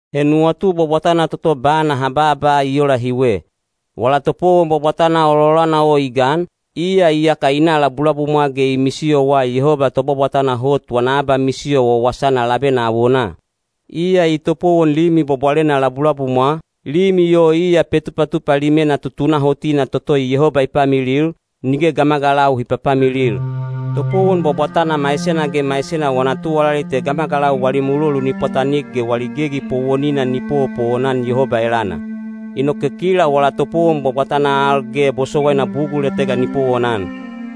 He nuwatu bwabwatana toto bana ha baaba i ola hiwe: wala topowon bwabwatana ololana o i gan, iya iyaka i na labulabumwa ge i misiyowa Yehoba Tobwabwatana Hot wana abamisiyo wawasana labena awonaa. Iya i topowon limi bwabwalena labulabumwa, limi o iya Petupatupa Limena tutunahotina toto Yehoba i pamilil, nige gamagalau hi papamilil. Topowon bwabwatana maisena ge maisena wana tuwalali te gamagalau wali mulolu ni pwatanik ge wali gegi powonina ni powopowon-an Yehoba elana. Inoke kila wala topowon bwabwatana al ge bosowaina bugul etega ni powonan.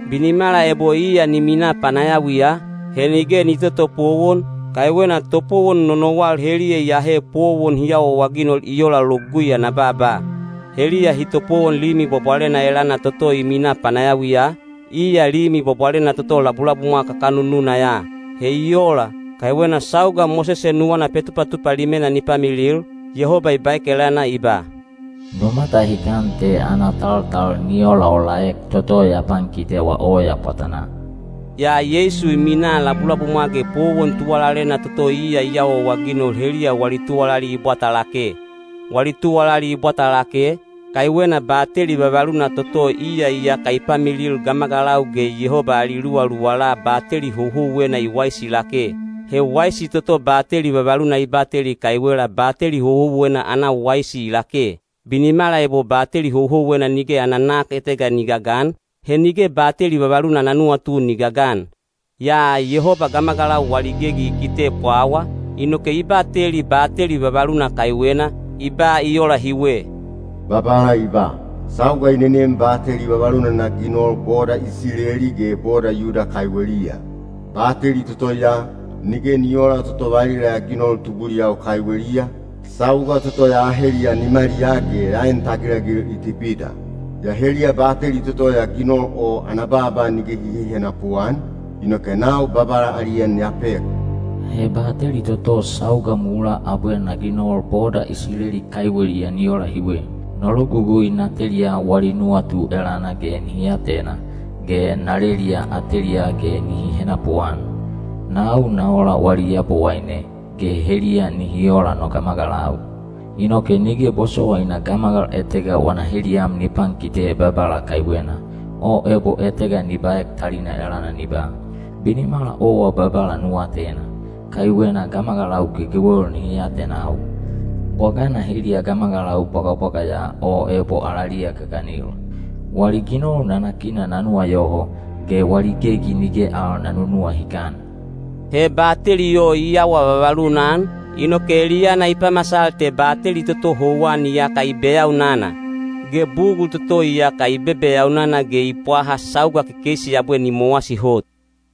Binimala ebo iya ni minaa panayawiya, he nige ni totopowon, kaiwena topowon nonowal heliya iyahe powon hi awaawaginol i ola Logugui ana baaba. (Heliya hi topowon limi bwabwalena elana toto i minaa panayawiya, iya limi bwabwalena toto labulabumwa kakanununa ya. He i ola, kaiwena sauga Mosese nuwana Petupatupa Limena ni pamilil, Yehoba i baek elana i ba, “Nu matahikan te ana taltal ni olaolaek toto ya pankitewa oya pwatanaa.”) Yaa Yeisu i minaa labulabumwa ge powon tuwalalena toto iya i awaawaginol heliya wali tuwalali i bwata lake. Wali tuwalali i bwata lake, kaiwena bateli vavaluna toto iya iyaka i pamilil gamagalau ge Yehoba ali luwaluwala bateli houhouwena i waisi lake. He waisi toto bateli vavaluna i bateli kaiwela bateli houhouwena ana waisi i lake. Binimala ebo bateli houhouwena nige ana nak etega ni gagan, he nige bateli vavaluna ana nuwatu ni gagan. Yaa Yehoba gamagalau wali gegi i kite pwawa, inoke i bateli bateli vavaluna kaiwena, i ba i ola hiwe: Babala i ba, “Sauga i nenem bateli vavaluna na ginol boda Isileli ge boda Yuda kaiweliya. Bateli toto ya, nige ni oola toto valila ya ginol tubuliyau kaiweliya, sauga toto ya aheliya nimaliyaa ge ya en tagilagil Itipita. Yaa heliya bateli toto ya ginol o ana baaba nige hi hehenapu-an, inoke nau Babala ali en ya pek. He bateli toto sauga mulaa abwe na ginol boda Isileli kaiweliya ni ola hiwe. No logugui na teliya wali nuwatu elana ge nihi atena, ge na leliya ateliyaa ge nihi henapuan. Nau na ola wali Yabowaine, ge heliya nihi ola no gamagalau. Inoke nige bosowaina gamagal etega wana heliyam ni pankite Babala kaiwena, o ebo etega ni baek talina elana ni ba, ‘Binimala owa Babala nu atena,’ kaiwena gamagalau gegewel nihi atenau, bwagana heliya gamagalau bwagabwaga ya o ebo alaliya gaganil. Wali ginol nanakina na nuwayoho, ge wali gegi nige al na nunuwahikan.” He bateli o i awa vavaluna-an, inoke eliyana i pamasal te bateli toto houwan iyaka i beyaunana. Ge bugul toto iyaka i bebeyaunana ge i pwaha sauga kekeisi abwe ni mowasi hot.